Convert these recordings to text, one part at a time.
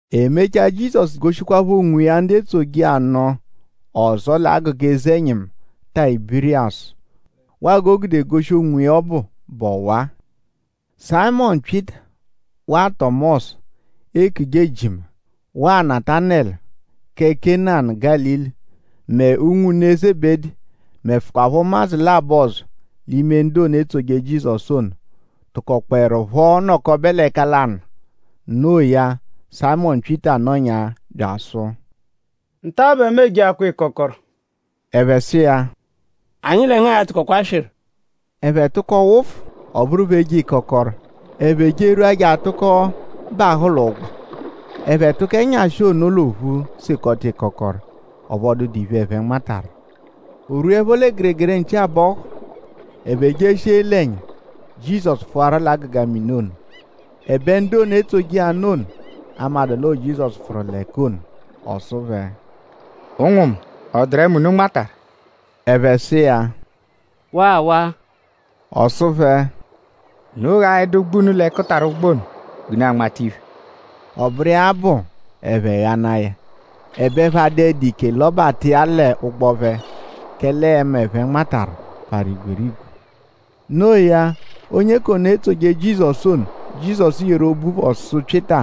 E mechaa; Jizọsu goshikwaphọ onwiya ndu etsoje iya nụ ọzo l'agụga eze-ẹnyimu Tayibiriyasu. Waa g'o gude goshi onwiya ọbu bụ ọwa-a: Sayịmonu Pyịta; waa Tọmosu, eekuje Ejima; waa Natanẹlu kẹ Kena Gálili; mẹ ụnwu Zebedi; mẹfukwapho ụmadzu labọ ọzo l'ime ndu ono, etsoje Jizọsu ono tụkokpoerupho nọkobe l'ẹka lanụ. Noo ya; Sayịmonu Pyịta nọnyaa bya asụ: “Nta-a bẹ mu ejeakwa ịkokoro.” Ẹphe sụ iya: “Anyi lẹ ngu a-tụkokwa swịru.” Ẹphe tụko wụfu; ọ bụru phẹ eje ịkokoro. Ẹphe jerwua je atụko bahụ l'ụgbo. Ẹphe tụko ẹnyashi ono l'ophu sekọta ịkokoro; ọphu ọ dụdu iphe, ẹphe nmataru. O -rwuẹpho lẹ gẹregere nchi-abọhu; ẹphe jeshia ele ẹnya; Jizọsu pfụwaru l'agụga mini ono; ẹbe ndu ono, etsoje iya nụ ono amadụ l'ọo Jizọsu pfụru l'ẹka ono. Ọ sụ phẹ: “Ụnwu mu;?ọ dụru ẹma, unu nmataru?” Ẹphe sụ iya: “Waawaa.” Ọ sụ phẹ: “Unu ghaẹdu ụgbu unu l'ẹkutara ụgbo ono g'unu a-nmata iphe.” Ọ bụru iya bụ ẹphe ghanaa ya; ẹbe ẹphe adụedu ike lọbata iya l'ụgbo phẹ; kẹle ẹma, ẹphe nmataru parụ igwerigwe. No iya; onye k'ono, etsoje Jizọsu ono, Jizọsu yeru obu phọ sụ Pyịta: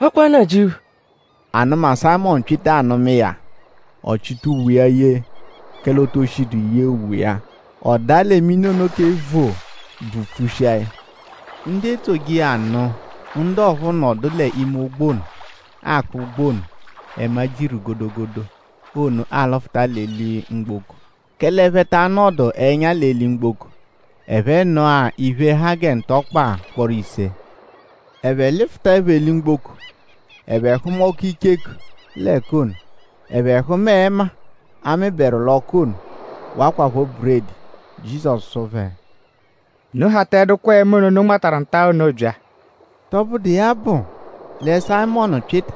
“Ọ kwa Nnajịuphu!” Anụma, Sayịmonu Pyịta anụma iya; ọ chịta uwe iya yee; kẹle o to shidu yee uwe iya. Ọ daa lẹ mini ono kẹ voo; bvupfushia ya. Ndu etsoje iya nụ ndu ọphuu nọdu l'ime ụgbo ono akpụ ụgbu ono, ẹma jiru godogodo ono alụfuta eli-mgboko; kẹle ẹphe ta anọdu ẹnya l'eli-mgboko. Ẹphe nọ-a iphe, ha gẹ ntọkpa ụkporo ise. Ẹphe lụfutaepho eli-mgboko; ẹphe hụma ọku icheku l'ẹka ono. Ẹphe hụma ẹma, a mịberu l'ọku ono; wakwaphọ buredi. Jizọsu sụ phẹ: “Unu hataẹdukwa ẹma ono, unu nmataru nta-a ono bya.” Tọbudu iya bụ lẹ Sayịmonu Pyịta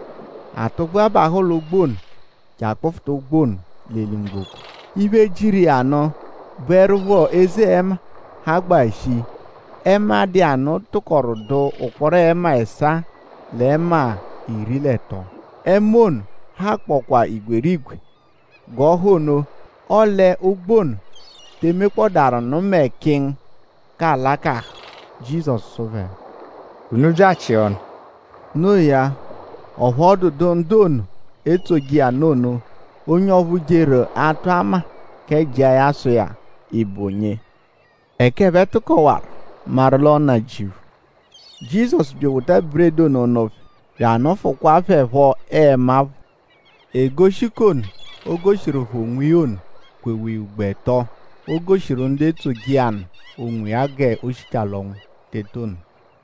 atụgbua bahụ l'ụgbo ono je akpụfuta ụgbu ono l'eli-mgboko. Iphe, jiru iya nụ bụerupho eze ẹma, hagbaa shii. Ẹma, dụ iya nụ tụkoru dụ ụkporo ẹma ẹsaa l'ẹma iri l'ẹto. Ẹma ono hakpọkwa igwerigwe g'ọ ha ono; ọle ụgbu ono te emekpọdaru mẹ kịngu k'alakahụ. Jizọsu sụ phẹ: “Unu bya achịa ọnu.” Noo ya; ọphu ọ dụedu ndu ono, etsoje iya nụ ono onye ọphu jeru atụ ama kẹ jịa ya sụ iya: “?Ị bụ onye?” Ẹka ẹphe tụkowaru maru l'ọo Nnajịuphu. Jizọsu bya ewota buredi ono nụ phẹ; bya anụfukwaa phẹ phọ ẹma phọ. Egoshi k'ono, o goshiru phẹ onwiya ono kwewa iya ugbo ẹto, o goshiru ndu etsoje iya nụ onwiya g'o shichaa l'ọnwu teta ono.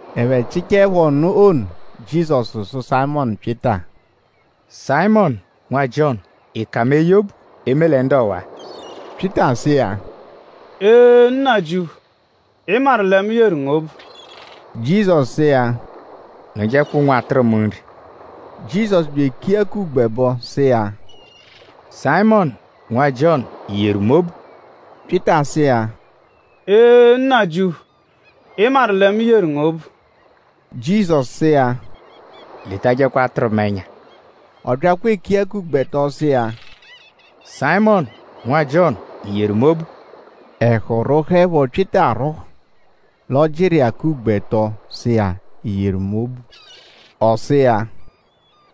Ẹphe chịchaepho ọnu ono; Jizọsu sụ Sayịmonu Pyịta: “Sayịmonu; nwa Jiọnu;?ị ka mu eye obu; eme lẹ ndu ọwa-a?” Pyịta sụ iya: “Ee; Nnajịuphu. Ị maru lẹ mu yeru ngu obu.” Jizọsu sụ iya: “Nụjekwa ụnwu atụru mu nri.” Jizọsu bya eku iya k'ugbo ẹbo sụ iya: “Sayịmonu; nwa Jiọnu;?I yeru mu obu?” Pyịta sụ iya: “Ee! Nnajịuphu; Ị maru lẹ mu yeru ngu obu.” Jizọsu sụ iya: “Letajẹkwa atụru mu ẹnya.” Ọ byakwa eku iya k'ugbo ẹto sụ iya: “Sayịmonu; nwa Jiọnu;?I yeru mu obu?” Ẹhu rwụhuepho Pyịta arwụhu l'ọ jịru iya ya k'ugbo ẹto sụ iya: “?I yeru mu obu?” Ọ sụ iya: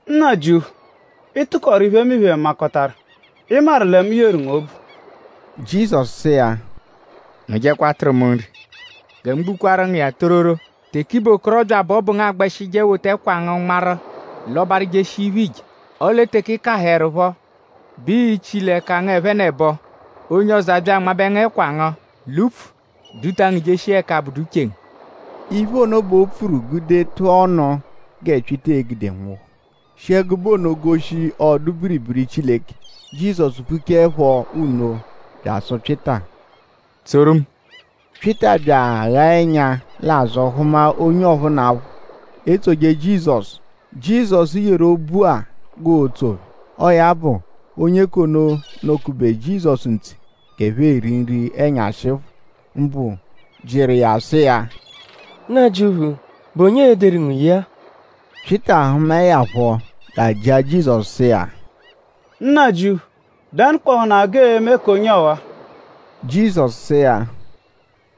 “Nnajịuphu; Ị tụkoru iphemiphe makọtaru; Ị maru lẹ mu yeru ngu obu.” Jizọsu sụ iya: “Nụjekwa atụru mu nri.” “Gẹ mu gbukwaaru ngu iya tororo; teke ị bụ okorọbya bẹ ọ bụ ngu agbẹshije wota ẹkwa ngu nmarụ lọbaru jeshia iphe, iije; ọle teke ị kahụerupho bẹ ii-chili ẹka ngu ẹphenebo; onye ọzo abya anmabẹ ngu ẹkwa ngu l'upfu; duta ngu jeshia ẹka abụdu uche ngu.” Iphe ono bẹ o pfuru gude tụa ọnu gẹ Pyịta e-gude nwụhu; shi ẹgube ono goshi ọdu-biribiri Chileke. Jizọsu pfuchaẹpho nno bya asụ Pyịta: “Tsoru mu.” Pyịta bya aghaa ẹnya l'azụ; hụma onye ọphunapho, etsoje Jizọsu, Jizọsu yeru obu-a g'ootso phẹ. Ọo ya bụ onye k'ono, nọ-kube Jizọsu ntse g'ẹphe eri nri-ẹnyashi phọ; mbụ jịru iya sụ iya: “Nnajịuphu;?bụ onye e-deru ngu ye-a?” Pyịta hụmae ya phọ bya ajịa Jizọsu sụ iya: “Nnajịuphu;?Dẹnukpohunaa g'ee-me k'onye ọwa?” Jizọsu sụ iya: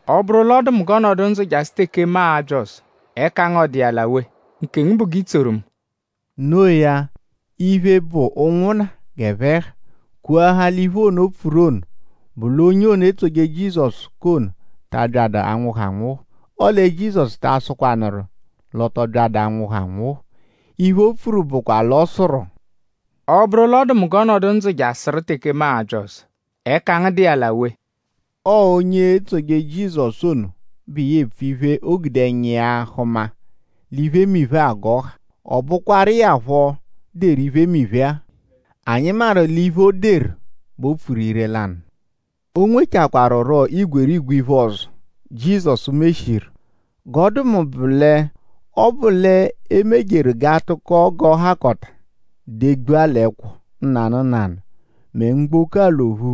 “Ọ -bụru l'ọ dụ mu g'ọ nọdu ndzụ jasụ teke mu a-bya ọzo;?ẹka ngu dụ iya l'awe? Nkengu bụ g'i tsoru mu.” No iya; iphe, bụ ụnwunna g'ẹphe ha kwoahaa l'iphe ono, o pfuru ono bụ l'onye etsoje Jizọsu k'ono ta abyadụ anwụhu anwụhu. Ọle Jizọsu ta asụkwaru l'ọ tọ byadu anwụhu anwụhu. Iphe, o pfuru bụkwa l'ọ sụru: “Ọ -bụru l'ọ dụ mu g'ọ nọdu ndzụ jasụru teke mu a-bya ọzo;?ẹka ngu dụ iya l'awe?” Ọo onye etsoje Jizọsu ono bụ iya epfu iphe, o gude ẹnya iya hụma l'iphemiphe-a g'ọ ha. Ọ bụkwaru iya phọ deru iphemiphe-a. Anyi maru l'iphe, o deru bẹ o pfuru ire-lanụ. O nwechakwaarurọ igwerigwe iphe ọzo, Jizọsu meshiru. G'ọ dụ mu bụ lẹ: ọ -bụ l'e mejeru g'a tụko g'ọ hakọta degbua l'ẹkwo nanụ nanụ; mẹ mgboko-a l'ophu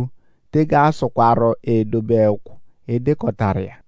tege asụkwaru edobe ẹkwo, e dekọtaru iya.